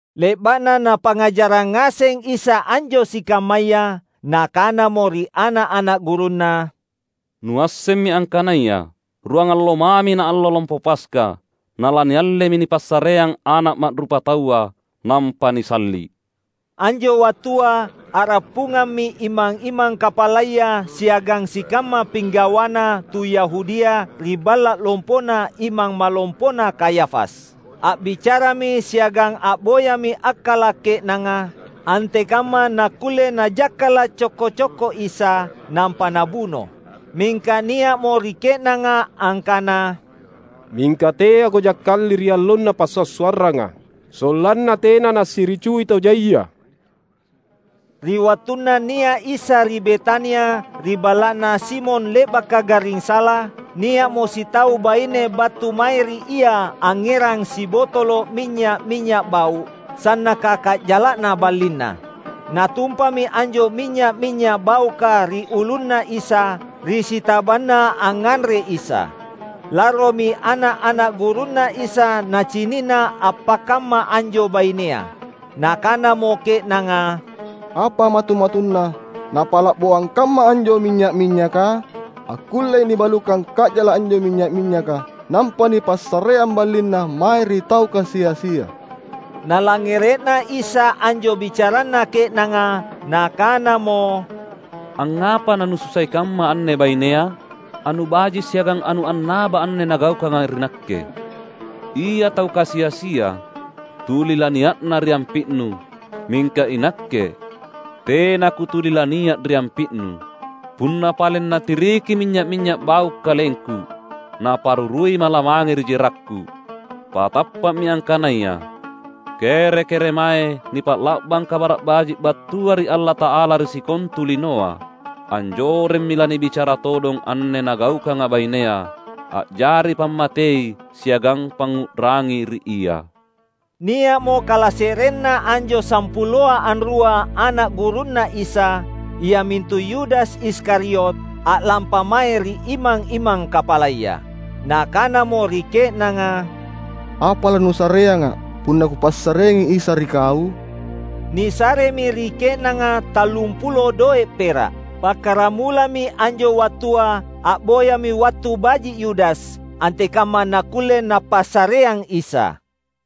Le’ba’na Napangngajarrang ngaseng Isa anjo sikammaya, Nakanamo ri ana’-ana’ gurunNa, "Nuassemmi angkanaya ruangallo mami naallo Lompo Paska, nalaniallemi nipassareang Ana’ Ma’rupataua nampa nisalli’!" Anjo wattua a’rappungammi imang-imang kapalaya siagang sikamma pinggawana tu Yahudia ri balla’ lompona Imang Malompona Kayafas. A’bicarami siagang a’boyami akkala’ ke’nanga, antekamma nakkulle najakkala’ cokko-cokko Isa, nampa nabuno. Mingka nia’mo ri ke’nanga angkana, "Mingka teako jakkali ri allonna passua’-suarranga, sollanna tena nasiricui tau jaia." Ri wattunna nia’ Isa ri Betania, ri balla’na Simon le’baka garring sala, nia’mo sitau baine battu mae ri Ia angngerang sibotolo’ minynya’-minynya’ bau’, sannaka ka’jala’na ballinna. Natumpami anjo minynya’-minynya’ bauka ri ulunNa Isa, ri sitabanna angnganre Isa. Larromi ana’-ana’ gurunNa Isa nacini’na appakamma anjo bainea. Nakanamo ke’nanga, "Apa matu-matunna napa’laboang kamma anjo minynya’-minynyaka? Akkullei nibalukang ka’jala’ anjo minynya’-minynyaka nampa nipassareang ballinna mae ri tau kasi-asia!" Nalangngere’na Isa anjo bicaranna ke’nanga, Nakanamo, "Angngapa nanususai kamma anne bainea? Anu baji’ siagang anu annaba anne nagaukanga ri Nakke. Ia tau kasi-asia tuli lania’na ri ampi’nu, mingka iNakke tena Kutuli lania’ ri ampi’nu. Punna paleng natiriki minynya’-minynya’ bau’ KalengKu, naparuruiMa’ lamange ri jerakKu. Patappa’mi angkanaya, kere-keremae nipa’la’bang Kabara’ Baji’ battua ri Allata’ala ri sikontu linoa, anjoremmi lanibicara todong anne nagaukanga bainea, a’jari pammatei siagang pangngu’rangi ri ia." Nia’mo kalase’renna anjo sampuloa anrua ana’ gurunNa Isa, iamintu Yudas Iskariot, a’lampa mae ri imang-imang kapalaya. Nakanamo ri ke’nanga, "Apa lanusareanga’ punna kupassareang Isa ri kau?" Nisaremi ri ke’nanga tallumpulo doe’ pera’. Pakkaramulami anjo wattua a’boyami wattu baji’ Yudas antekamma nakkulle napassareang Isa.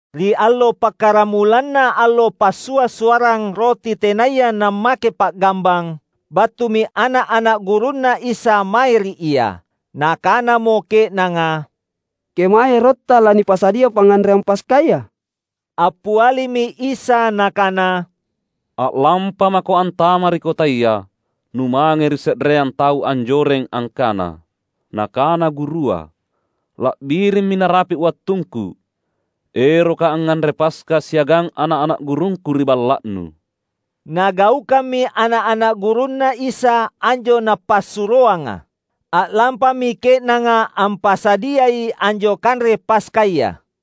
Ri allo pakkaramulanna allo Passua’-suarrang Roti Tenaya Nammake Pa’gambang, battumi ana’-ana’ gurunNa Isa mae ri Ia. Nakanamo ke’nanga, "Kemae erotTa lanipasadia pangnganreang Paskaya?" Appialimi Isa Nakana, "A’lampamako antama’ ri kotaya, numange ri se’reang tau anjoreng, angkana, ‘Nakana Gurua: La’birimmi narapi’ wattungKu; eroKa’ angnganre Paska siagang ana’-ana’ gurungKu ri balla’nu.’" Nagaukammi ana’-ana’ gurunNa Isa anjo Napassuroanga. A’lampami ke’nanga ampasadiai anjo kanre Paskaya.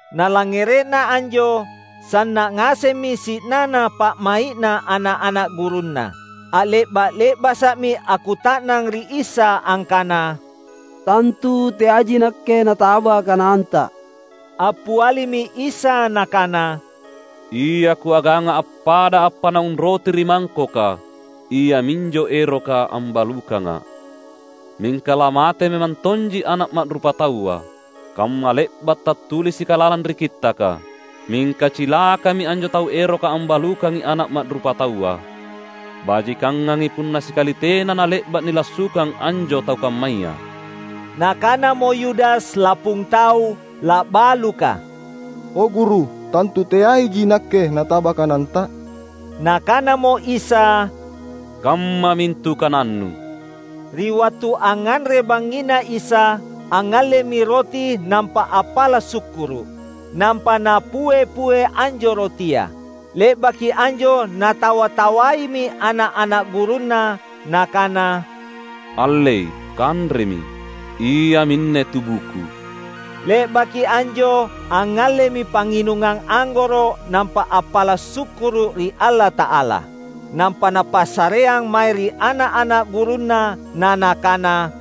Nalangngere’na anjo, sanna’ ngasemmi si’nana pa’mai’na ana’-ana’ gurunNa. A’le’ba’-le’basa’mi akkuta’nang ri Isa angkana, "Tantu teaiji nakke nataba kananTa?" Appialimi Isa Nakana, "Ia Kuaganga appada appanaung roti ri mangkoka, iaminjo eroka ambalukangA’. Mingka lamate memang tonji Ana’ Ma’rupataua, kamma le’ba’ tattulisika lalang ri Kittaka. Mingka cilakami anjo tau eroka ambalukangi Ana’ Ma’rupataua! Bajikangngangi punna sikali tena nale’ba’ nilassukang anjo tau kammaya." Nakanamo Yudas lapung tau la’baluka, "O, Guru, tantu teaiji nakke nataba kananTa?" Nakanamo Isa, "Kamma mintu kanannu!" Ri wattu angnganre bangngina Isa, angngallemi roti nampa appala’ sukkuru’. Nampa Napue-pue anjo rotia. Le’baki anjo Natawa-tawaimi ana’-ana’ gurunNa, Nakana, "Allei, kanremi, iaminne tubuKu." Le’baki anjo angngallemi pangnginungang anggoro’ nampa appala’ sukkuru’ ri Allata’ala. Nampa Napassareang mae ri ana’-ana’ gurunNa, na Nakana,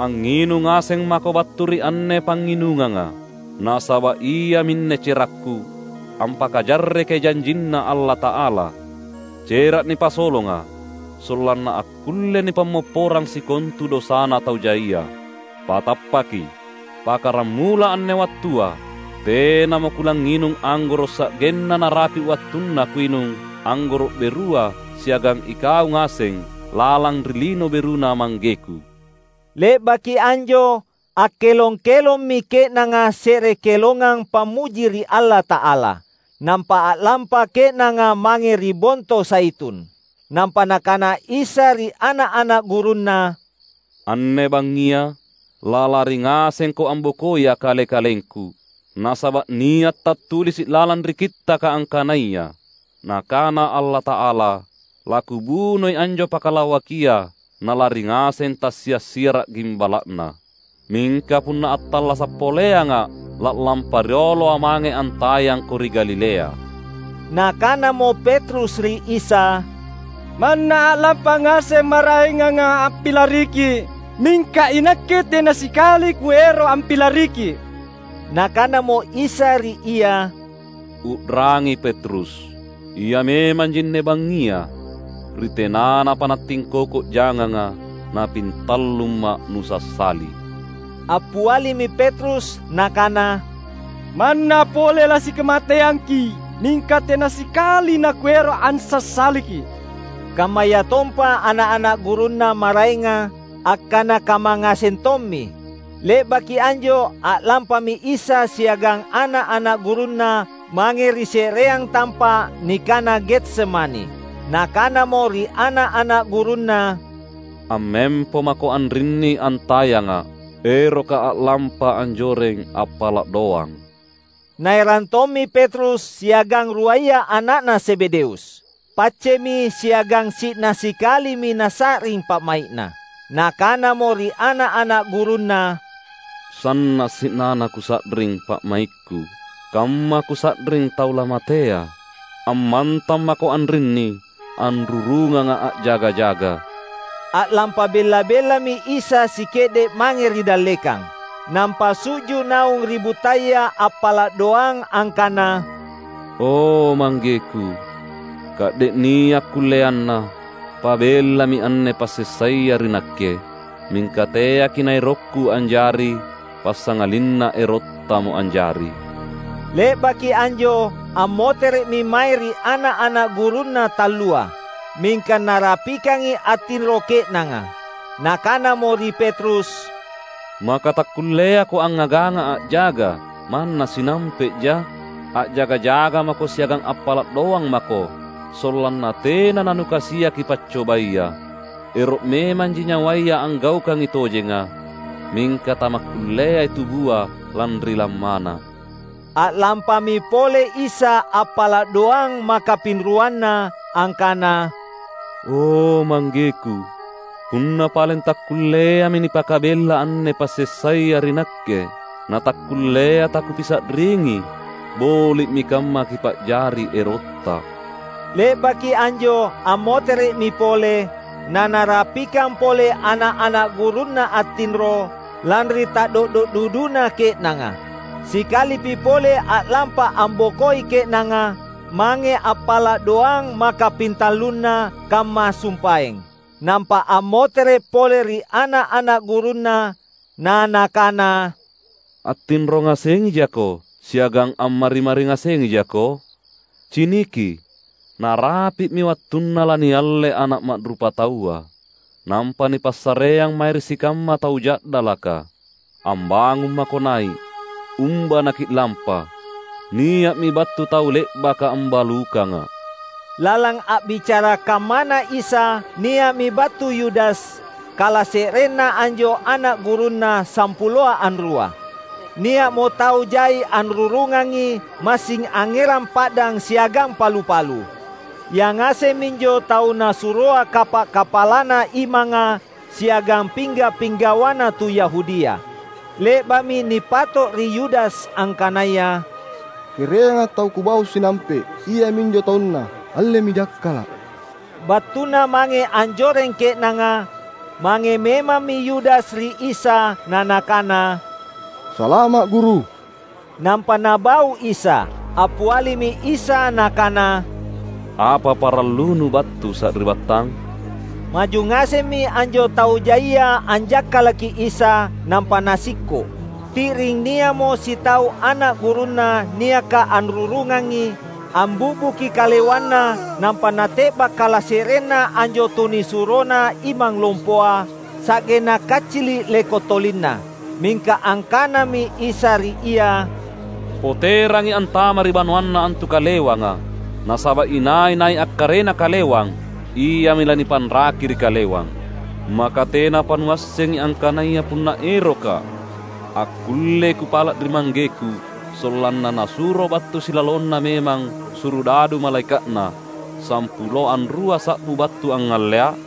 "Angnginung ngaseng mako battu ri anne pangnginunganga. Nasaba’ iaminne cerakKu, ampakajarrekai janjinNa Allata’ala — cera’ nipasolonga, sollanna akkulle nipammopporang sikontu dosana tau jaia. Patappaki: Pakkaramula anne wattua, tenamo Kulangnginung anggoro’ sa’genna narapi’ wattunna Kuinung anggoro’ berua siagang ikau ngaseng lalang ri Lino BeruNa ManggeKu." Le’baki anjo, akkelong-kelommi ke’nanga se’re kelongang pammuji ri Allata’ala. Nampa a’lampa ke’nanga mange ri Bonto Zaitun. Nampa Nakana Isa ri ana’-ana’ gurunNa, "Anne bangngia lalari ngasengko ambokoiA’ Kale-kalengKu; nasaba’ nia’ tattulisi’ lalang ri Kittaka angkanaya: Nakana Allata’ala, ‘LaKubunoi anjo pakalawakia, nalari ngaseng tassia’-siara’ gimbala’na.’ Mingka punna attallasa’ poleangA’, la’lampa rioloA’ mange antayangko ri Galilea." Nakanamo Petrus ri Isa, "Manna a’lampa ngaseng maraenganga ampilariKi’, mingka inakke tena sikali kuero’ ampilariKi’!" Nakanamo Isa ri ia, "U’rangi Petrus! Ia memang jinne bangngia, ri tenanapa nattingkoko janganga napintallumMa’ nusassali." Appialimi Petrus nakana, "Manna pole lasikamateangki’, mingka tena sikali nakuero’ ansassaliKi’!" Kammayatompa ana’-ana’ gurunNa maraenga akkana kamma ngaseng tommi. Le’baki anjo a’lampami Isa siagang ana’-ana’ gurunNa mange ri se’reang tampa’ nikana Getsemani. Nakanamo ri ana’-ana’ gurunNa, "Ammempo mako anrinni antayangA’, erokKa’ a’lampa anjoreng appala’ doang." Naerang tommi Petrus siagang ruaya ana’na Zebedeus. Paccemi siagang si’na sikalimi Nasa’ring pa’mai’Na. Nakanamo ri ana’-ana’ gurunNa, "Sanna’ si’nana Kusa’ring pa’maikKu, kamma Kusa’ring tau lamatea. Ammantang mako anrinni anrurungangA’ a’jaga-jaga." A’lampa bella-bellami Isa sike’de’ mange ri dallekang, nampa su’ju’ naung ri buttaya appala’ doang angkana, "O, ManggeKu, ka’de’ nia’ kulleanna, pabellami anne passessaya ri Nakke. Mingka teaKi’ naerokKu anjari, passangalinna erotTamo anjari." Le’baki anjo, ammotere’mi mae ri ana’-ana’ gurunNa tallua. Mingka narapikangi attinro ke’nanga. Nakanamo ri Petrus, "Maka takkulleako angngagangA’ a’jaga manna sinampe’ja? A’jaga-jaga mako siagang appala’ doang mako, sollanna tena nanukasiaki paccobaya. Ero’ memanji nyawaya anggaukangi tojenga, mingka tamakkulleai tubua lanri lammana." A’lampami pole Isa appala’ doang maka pinruanna angkana, "O, ManggeKu, punna paleng takkulleami nipakabella anne passessaya ri Nakke, natakkullea taKupisa’ringi, boli’mi kamma Kipa’jari erotTa." Le’baki anjo ammotere’mi pole, nanarapikang pole ana’-ana’ gurunNa attinro, lanri ta’do’do’ duduna ke’nanga. Sikalipi pole a’lampa ambokoi ke’nanga, mange appala’ doang maka pintallunna, kamma sumpaeng. Nampa ammotere’ pole ri ana’-ana’ gurunNa, na Nakana, "Attinro ngasengijako siagang ammari-mari ngasengijako? Ciniki, narapi’mi wattunna lanialle Ana’ Ma’rupataua, nampa nipassareang mae ri sikamma tau ja’dalaka. Ambangung mako nai’, umba naki’lampa! Nia’mi battu tau le’baka ambalukangA’." Lalang a’bicara kammana Isa, nia’mi battu Yudas, kalase’renna anjo ana’ gurunNa sampuloa anrua. Nia’mo tau jai anrurungangi, massing angngerang pa’dang siagang palu-palu. Yangaseng minjo tau nasuroa kapa’-kapalana imanga siagang pingga’-pinggawana tu Yahudia. Le’ba’mi nipato ri Yudas angkanaya, "Kereanga tau kubau sinampe’, iaminjo taunna, allemi jakkala’!" Battuna mange anjoreng ke’nanga, mange memammi Yudas ri Isa na nakana, "Salama’, Guru!" Nampa nabau Isa. Appialimi Isa Nakana, "Apa parallunu battu sari’battang?" Maju ngasemmi anjo tau jaia anjakkalaki Isa, nampa nasikko’. Ti’ring nia’mo sitau ana’ gurunNa niaka anrurungangi, ambi’buki kalewanna, nampa nate’ba’ kalase’renna anjo tunisurona imang lompoa, sa’genna kaccili’ leko’ tolinna. Mingka angkanami Isa ri ia, "Poterangi antama’ ri banoanna antu kalewanga; nasaba’ inai-nai akkarena kalewang, iami lanipanraki ri kalewang. Maka tenapa nuassengi angkanaya punna erokKa’, akkullei Kupala’ ri ManggeKu sollanna Nasuro battu silalonna memang surudadu malaeka’Na, sampulo anrua sa’bu battu angngalleiA’?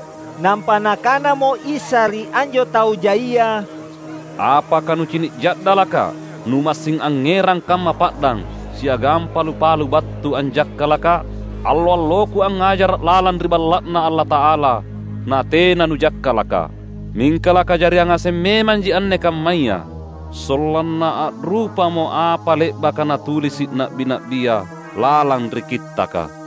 Nampa Nakanamo Isa ri anjo tau jaia, "Apaka nucini’ ja’dalakKa’ numassing angngerang kamma pa’dang siagang palu-palu battu anjakkalakKa’? Allo-alloKu angngajara’ lalang ri Balla’Na Allata’ala natena nujakkalakKa’! Mingka lakajariang ngaseng memanji anne kammaya, sollanna a’rupamo apa le’baka natulisi’ na’bi-na’bia lalang ri Kittaka."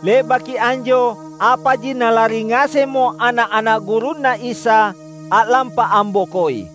Le’baki anjo, apaji nalari ngasemmo ana’-ana’ gurunNa Isa, a’lampa ambokoi.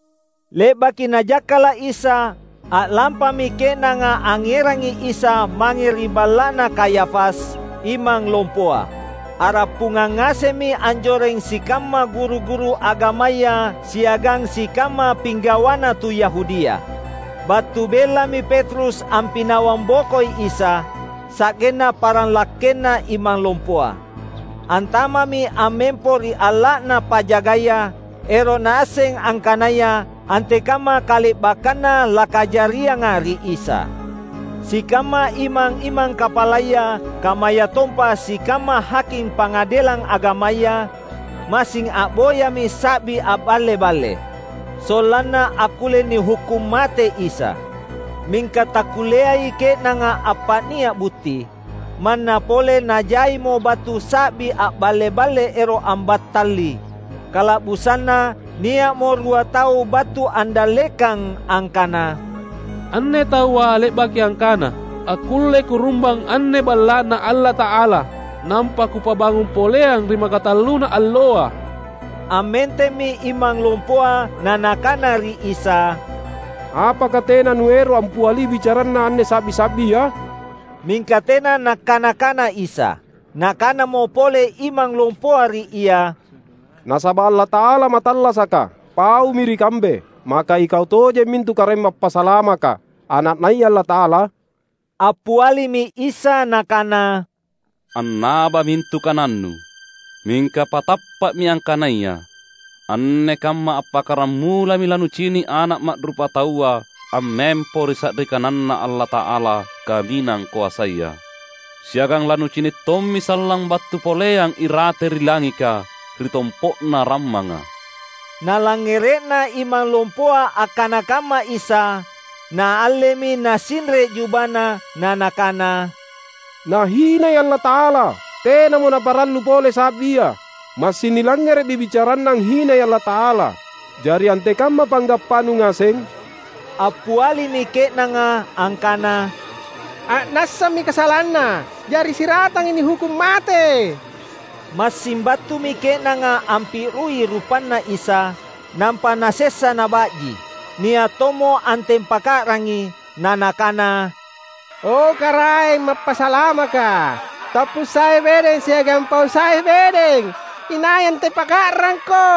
Le’baki najakkala’ Isa, a’lampami ke’nanga angngerangi Isa mange ri balla’na Kayafas, Imang Lompoa. A’rappungang ngasemmi anjoreng sikamma guru-guru agamaya siagang sikamma pinggawana tu Yahudia. Battu bellami Petrus ampinawang bokoi Isa, sa’genna paranglakkenna Imang Lompoa. Antama’mi ammempo ri alla’na pajagaya, ero’ naasseng angkanaya antekamma kale’bakkanna lakajarianga ri Isa. Sikamma imang-imang kapalaya kammayatompa sikamma haking Pangadelang Agamaya, massing a’boyami sa’bi a’balle-balle, sollanna akkulle nihukkung mate Isa. Mingka takkulleai ke’nanga appa’nia’ butti, manna pole najaimo battu sa’bi a’balle-balle ero’ ambattali. Kala’busanna nia’mo rua tau battu andallekang angkana, "Anne taua le’baki angkana, ‘Akkullei Kurumbang anne Balla’Na Allata’ala, nampa Kupabangung poleang ri makatalluna alloa.’" Ammentemmi imang lompoa na nakana ri Isa, "Apaka tena Nuero’ ampiali bicaranna anne sa’bi-sa’bia?" Mingka tena Nakkana-kana Isa. Nakanamo pole imang lompoa ri Ia, "Nasaba’ Allata’ala mattallasaka, paumi ri kambe, maka Ikau tojeng mintu Karaeng Mappasalamaka, Ana’naya Allata’ala?" Appialimi Isa Nakana, "Annaba mintu kanannu. Mingka patappa’mi angkanaya: Anne kamma appakkaramulami lanucini’ Ana’ Ma’rupataua ammempo ri sa’ri kananNa Allata’ala Kaminang Koasaya. Siagang lanucini’ tommi sallang battu poleang irate ri langika ri tompo’na rammanga!" Nalangngere’na imang lompoa akkana kamma Isa, naallemi nasinre’ jubana na nakana, "Nahinai Allata’ala! Tenamo naparallu pole sa’bia. Massing nilangngere’mi bicaranNa anghinai Allata’ala. Jari antekamma panggappanu ngaseng?" Appialimi ke’nanga angkana, "A’nassami kasalanna. Jari siratangi nihukkung mate." Massing battumi ke’nanga ampi’rui rupanNa Isa, nampa nasessa naba’ji. Nia’ tommo antempaka’rangi, na nakana, "O, Karaeng Mappasalamaka, tappu sai bedeng siagang pau sai bedeng, inai antempaka’rangKo?"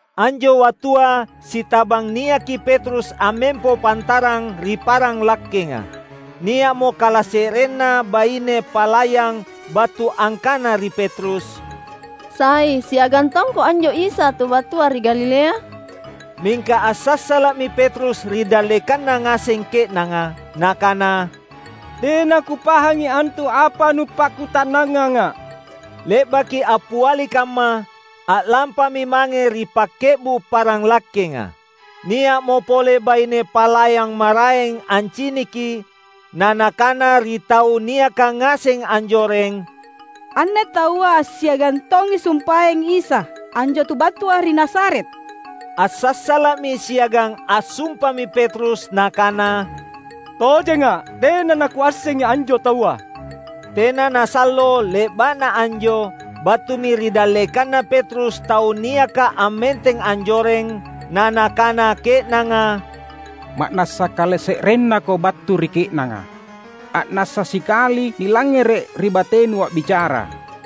Anjo wattua sitabang niaki Petrus ammempo pantarang ri paranglakkenga. Nia’mo kalase’renna baine palayang battu angkana ri Petrus, "Sai siagang tongko anjo Isa tu battua ri Galilea?" Mingka assassala’mi Petrus ri dallekanna ngaseng ke’nanga, nakana, "Tena kupahangi antu apa nupakkuta’nanganga." Le’baki appiali kamma, a’lampami mange ri pakke’bu’ parang lakkenga. Nia’mo pole baine palayang maraeng anciniki; na nakana ri tau niaka ngaseng anjoreng, "Anne taua assiagang tongi sumpaeng Isa, anjo tu battua ri Nazaret." Assassala’mi siagang assumpami Petrus nakana, "Tojenga’, tena nakuassengi anjo taua!" Tena nasallo le’ba’na anjo, battumi ri dallekanna Petrus tau niaka ammenteng anjoreng, na nakana ke’nanga, "Ma’nassa kalase’rennako battu ri ke’nanga. A’nassa sikali nilangngere’ ri batenu a’bicara."